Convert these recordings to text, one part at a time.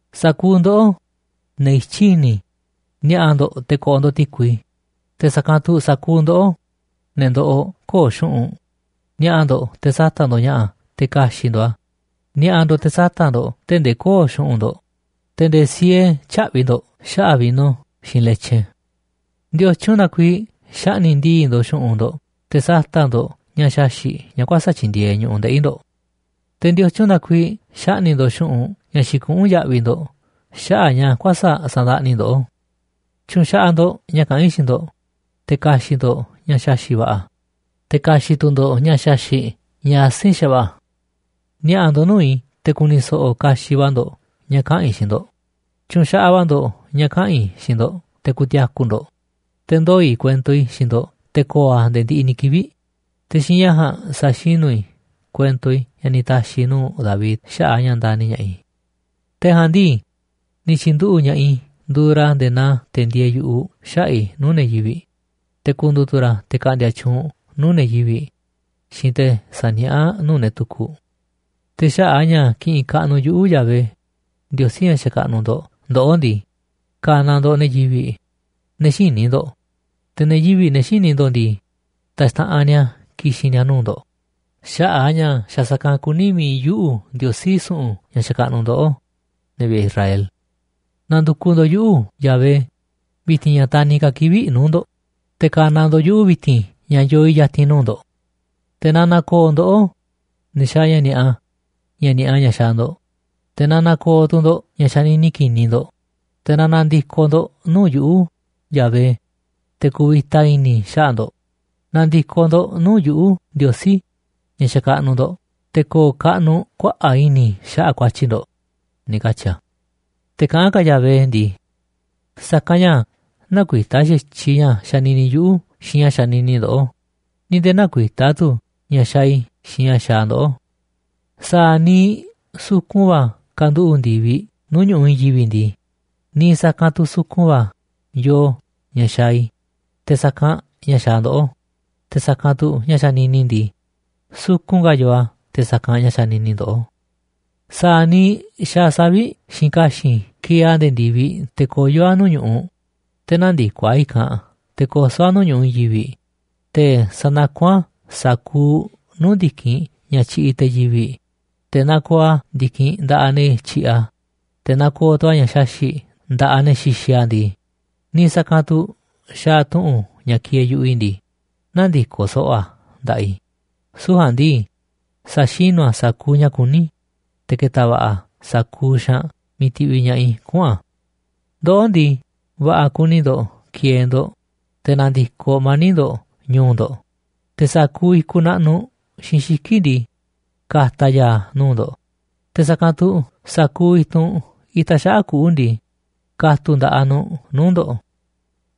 ’Sa̱kuuꞌ ndoꞌó, ne̱ ityí i̱ni̱, ni̱a̱ꞌa̱ ndo̱ꞌ te̱ ko̱ꞌo̱ ndo̱ꞌ ti̱kui. Te̱ sa̱kanꞌ tu̱ sa̱kuuꞌ ndoꞌó, ne̱ ndoꞌoꞌ köo̱ꞌ xu̱ꞌunꞌ, ni̱a̱ꞌa̱ ndo̱ꞌ te̱ sa̱ta̱ꞌ ndo̱ꞌ ña̱ꞌa̱ te̱ ka̱xi̱ꞌ ndo̱ꞌ a̱. Ni̱a̱ꞌa̱ ndo̱ꞌ te̱ sa̱ta̱ꞌ ndo̱ꞌ tee̱ꞌ ndee kö̱o̱ꞌ xu̱ꞌunꞌ ndo̱ꞌ, te̱ nde̱e̱ siee tyä̱ꞌvi̱ ndo̱ꞌ xaꞌa̱ꞌ vino xiinꞌ letyin. ¿Ndiotyun na kuiiꞌ xaꞌni̱ꞌ ndii̱ꞌ ndo̱ꞌ xu̱ꞌunꞌ ndo̱ꞌ te̱ sata̱ꞌ ndo̱ꞌ ña̱ xaxi̱ꞌ ña̱ kuäsa̱ꞌ tyindieeꞌ ñu̱ꞌuꞌ ndeꞌi̱ ndo̱ꞌ? ¿Te̱ ndiotyun na kuiiꞌ xaꞌni̱ꞌ ndo̱ꞌ xu̱ꞌunꞌ ña̱ xikuꞌún yaꞌviꞌ ndo̱ꞌ xaꞌa̱ꞌ ña̱ kuäsa̱ꞌ sandaꞌni ndoꞌó? Tyu̱nxaꞌaꞌ ndo̱ꞌ ña̱ kaꞌán i̱ xiinꞌ ndo̱ꞌ, te̱ ka̱xi̱ꞌ ndo̱ꞌ ña̱ xaxi̱ꞌ va̱ꞌa̱, te̱ ka̱xi̱ꞌ tu̱ ndo̱ꞌ ña̱ xaxi̱ꞌ ña̱ asi̱nꞌ xa̱va̱ꞌa̱. Ni̱a̱ꞌa̱ ndo̱ꞌ nuu̱ꞌ i̱ te̱ ku̱ni̱ so̱ꞌo̱ kaxiꞌ va̱ ndo̱ꞌ ña̱ kaꞌa̱n i̱ xiinꞌ ndo̱ꞌ. Tyu̱nxaꞌaꞌ va̱ ndo̱ꞌ ña̱ kaꞌa̱n i̱ xiinꞌ ndo̱ꞌ te̱ ku̱ti̱a̱ku̱ ndo̱ꞌ. Te̱ ndoo̱ i̱ kuento i̱ xiinꞌ ndo̱ꞌ te̱ ko̱o̱ a̱ nde̱e̱ ndiꞌiꞌ ni̱ kivi̱ꞌ. Te̱ xiinꞌ ña̱ ja̱a̱nꞌ sa̱xinu̱ i̱ kuento i̱ ña̱ ni̱ ta̱xi̱ i̱ nuu̱ꞌ David xaꞌa̱ꞌ a̱ ña̱ ndani̱ ña̱ꞌaꞌ i̱. Te̱ ja̱a̱nꞌ ndii, ni̱ tyi̱nduꞌu̱ꞌ ña̱ꞌaꞌ i̱ nduuꞌ ra̱ nde̱e̱ naa te̱ ndieeꞌ yu̱ꞌuꞌ xaꞌa̱ꞌ i̱ nuu̱ꞌ ne̱ yivi̱ꞌ. Te̱ ku̱ndu̱u̱ tu̱ ra̱ te̱ ka̱ꞌndi̱a̱ tyuunꞌ nuu̱ꞌ ne̱ yivi̱ꞌ xiinꞌ te̱ saniaꞌá nuu̱ꞌ ne̱ tukuꞌ. Te̱ xaꞌa̱ꞌ a̱ ña̱ kiꞌinꞌ kaꞌnuꞌ yuꞌu̱, Yahvé, Ndiosí ña̱ xakaꞌnuꞌ ndo̱ꞌ ndoꞌó ndii, ka̱na̱ ndo̱ꞌ ne̱ yivi̱ꞌ, ne̱ xïní ndo̱ꞌ. Te̱ ne̱ yivi̱ꞌ, ne̱ xïní ndoꞌó ndii, taxtaꞌanꞌ ni̱a̱ ki̱xi̱n ni̱a̱ nuu̱ꞌ ndo̱ꞌ xaꞌa̱ꞌ a̱ ña̱ xa̱ sa̱kanꞌ kuní mi̱iꞌ yuꞌu̱, Ndiosí su̱ꞌu̱n ña̱ xakaꞌnuꞌ ndoꞌó, ne̱ vi̱ꞌe̱ Israel. ’Na̱ndu̱kuꞌ ndo̱ꞌ yuꞌu̱ꞌ, Yahvé, vi̱ti̱n ña̱ taniꞌ ka̱ kivi̱ꞌ nuu̱ꞌ ndo̱ꞌ, te̱ ka̱na̱ ndo̱ꞌ yuꞌu̱ vi̱ti̱n ña̱ yoo i̱ ya̱ti̱n nuu̱ꞌ ndo̱ꞌ. Te̱ na na̱ko̱o̱ ndoꞌó, ne̱ xaaꞌ ña̱ ni̱a̱ꞌa, ña̱ ni̱a̱ꞌa ña̱ xaaꞌ ndo̱ꞌ, te̱ na na̱ko̱o̱ tu̱ ndo̱ꞌ ña̱ xanini ki̱ni̱ ndo̱ꞌ, te̱ na na̱ndi̱koꞌ ndo̱ꞌ nuu̱ꞌ yuꞌu̱, Yahvé, te̱ ku̱vi̱ta i̱ni̱ i̱ xaꞌa̱ꞌ ndo̱ꞌ. Na̱ndi̱koꞌ ndo̱ꞌ nuu̱ꞌ yuꞌu̱ꞌ, Ndiosí ña̱ xakaꞌnuꞌ ndo̱ꞌ, te̱ ko̱o̱ kaꞌnuꞌ kuaꞌa̱ꞌ i̱ni̱ i̱ xaꞌa̱ꞌ ku̱a̱tyi̱ ndo̱ꞌ”, ni̱ katyi̱ a̱. Te̱ kaꞌán ka̱ Yahvé ndii: “Sa̱kanꞌ ña̱ näkuitá xa̱tyiꞌ ña̱ xanini yuꞌu̱ xiinꞌ ña̱ xanini ndoꞌó, ni̱ nde̱e̱ näkuitá tu̱ ña̱ xaaꞌ i̱ xiinꞌ ña̱ xaaꞌ ndoꞌó. Sa̱a̱ niiꞌ sukun va̱ kanduꞌu̱ꞌ ndi̱viꞌ nuu̱ꞌ ñu̱ꞌuꞌ i̱i̱n yivi̱ꞌ ndii, niiꞌ sa̱kanꞌ tu̱ sukun va̱ yoo ña̱ xaaꞌ i̱ te̱ sa̱kanꞌ ña̱ xaaꞌ ndoꞌó, te̱ sa̱kanꞌ tu̱ ña̱ xanini i̱ ndii, sukun ka̱ yoo a̱ te̱ sa̱kanꞌ ña̱ xanini ndoꞌó. Sa̱a̱ niiꞌ xaaꞌ savi̱ꞌ xiinꞌ ka̱xi̱n kieeꞌ a̱ nde̱e̱ ndi̱viꞌ te̱ koyó a̱ nuu̱ꞌ ñu̱ꞌuꞌ, te̱ nändikoꞌ a̱ i̱kanꞌ nde̱e̱ koso̱ a̱ nuu̱ꞌ ñu̱ꞌuꞌ i̱i̱n yivi̱ꞌ, te̱ sa̱nakún a̱ sa̱kuuꞌ nuu̱ꞌ ndi̱kinꞌ ña̱ tyiꞌiꞌ te̱ yivi̱ꞌ, te̱ nakooꞌ a̱ ndi̱kinꞌ nda̱ꞌaꞌ ne̱ tyiꞌiꞌ a̱, te̱ nakooꞌ tu̱ a̱ ña̱ xaxi̱ꞌ nda̱ꞌaꞌ ne̱ xixiꞌ a̱ ndii, niiꞌ sa̱kanꞌ tu̱ xaaꞌ tu̱ꞌu̱n ña̱ kieeꞌ yu̱ꞌuꞌ i̱ ndii, nä̱ndi̱koꞌ so̱ꞌo̱ a̱ nda̱ꞌaꞌ i̱. Süu̱ꞌ ja̱a̱nꞌ ndii, sa̱xinu̱ a̱ sa̱kuuꞌ ña̱ kuní i̱, te̱ ke̱ta̱ va̱ꞌa̱ a̱ sa̱kuuꞌ xaanꞌ miiꞌ ti̱ꞌviꞌ ña̱ꞌaꞌ i̱ kuꞌu̱n a̱. ’Ndoꞌó ndii, va̱ꞌa̱ kuni ndo̱ꞌ ki̱e̱e̱ ndo̱ꞌ, te̱ na̱ndi̱koꞌ mani̱ꞌ ndo̱ꞌ ñu̱u̱ ndo̱ꞌ. Te̱ sa̱kuuꞌ i̱kuꞌ naꞌnuꞌ xiinꞌ xiki̱ꞌ ndii, ka̱ta̱ a̱ ya̱a̱ nuu̱ꞌ ndo̱ꞌ, te̱ sa̱kanꞌ tu̱ sa̱kuuꞌ i̱tunꞌ itaꞌ xaꞌa̱ꞌ kuꞌu̱ ndii, ka̱tu̱ꞌ nda̱ꞌaꞌ nu̱ꞌ nuu̱ꞌ ndo̱ꞌ.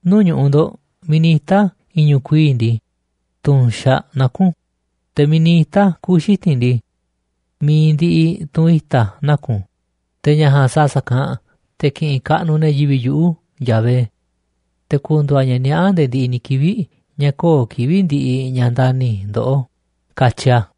Nuu̱ꞌ ñu̱ꞌuꞌ ndo̱ꞌ miiꞌ ni̱ ita̱ i̱ñu̱ꞌ kuii̱ꞌ ndii, tu̱nxaꞌ naku̱n. Te̱ miiꞌ ni̱ ita̱ kuꞌu̱ xiti̱nꞌ ndii, mi̱iꞌ ndiꞌiꞌ tunꞌ i̱ta̱ naku̱n. Te̱ ña̱ ja̱a̱nꞌ sa̱a̱ sa̱kanꞌ te̱ ki̱ꞌi̱n kaꞌnuꞌ ne̱ yivi̱ꞌ yuꞌu̱, Yahvé, te̱ ku̱ndu̱u̱ a̱ ña̱ niaꞌá nde̱e̱ ndiꞌiꞌ ni̱ kivi̱ꞌ ña̱ köo̱ꞌ kivi̱ꞌ ndiꞌiꞌ ña̱ ndani̱ i̱ ndoꞌó”, katyi a̱.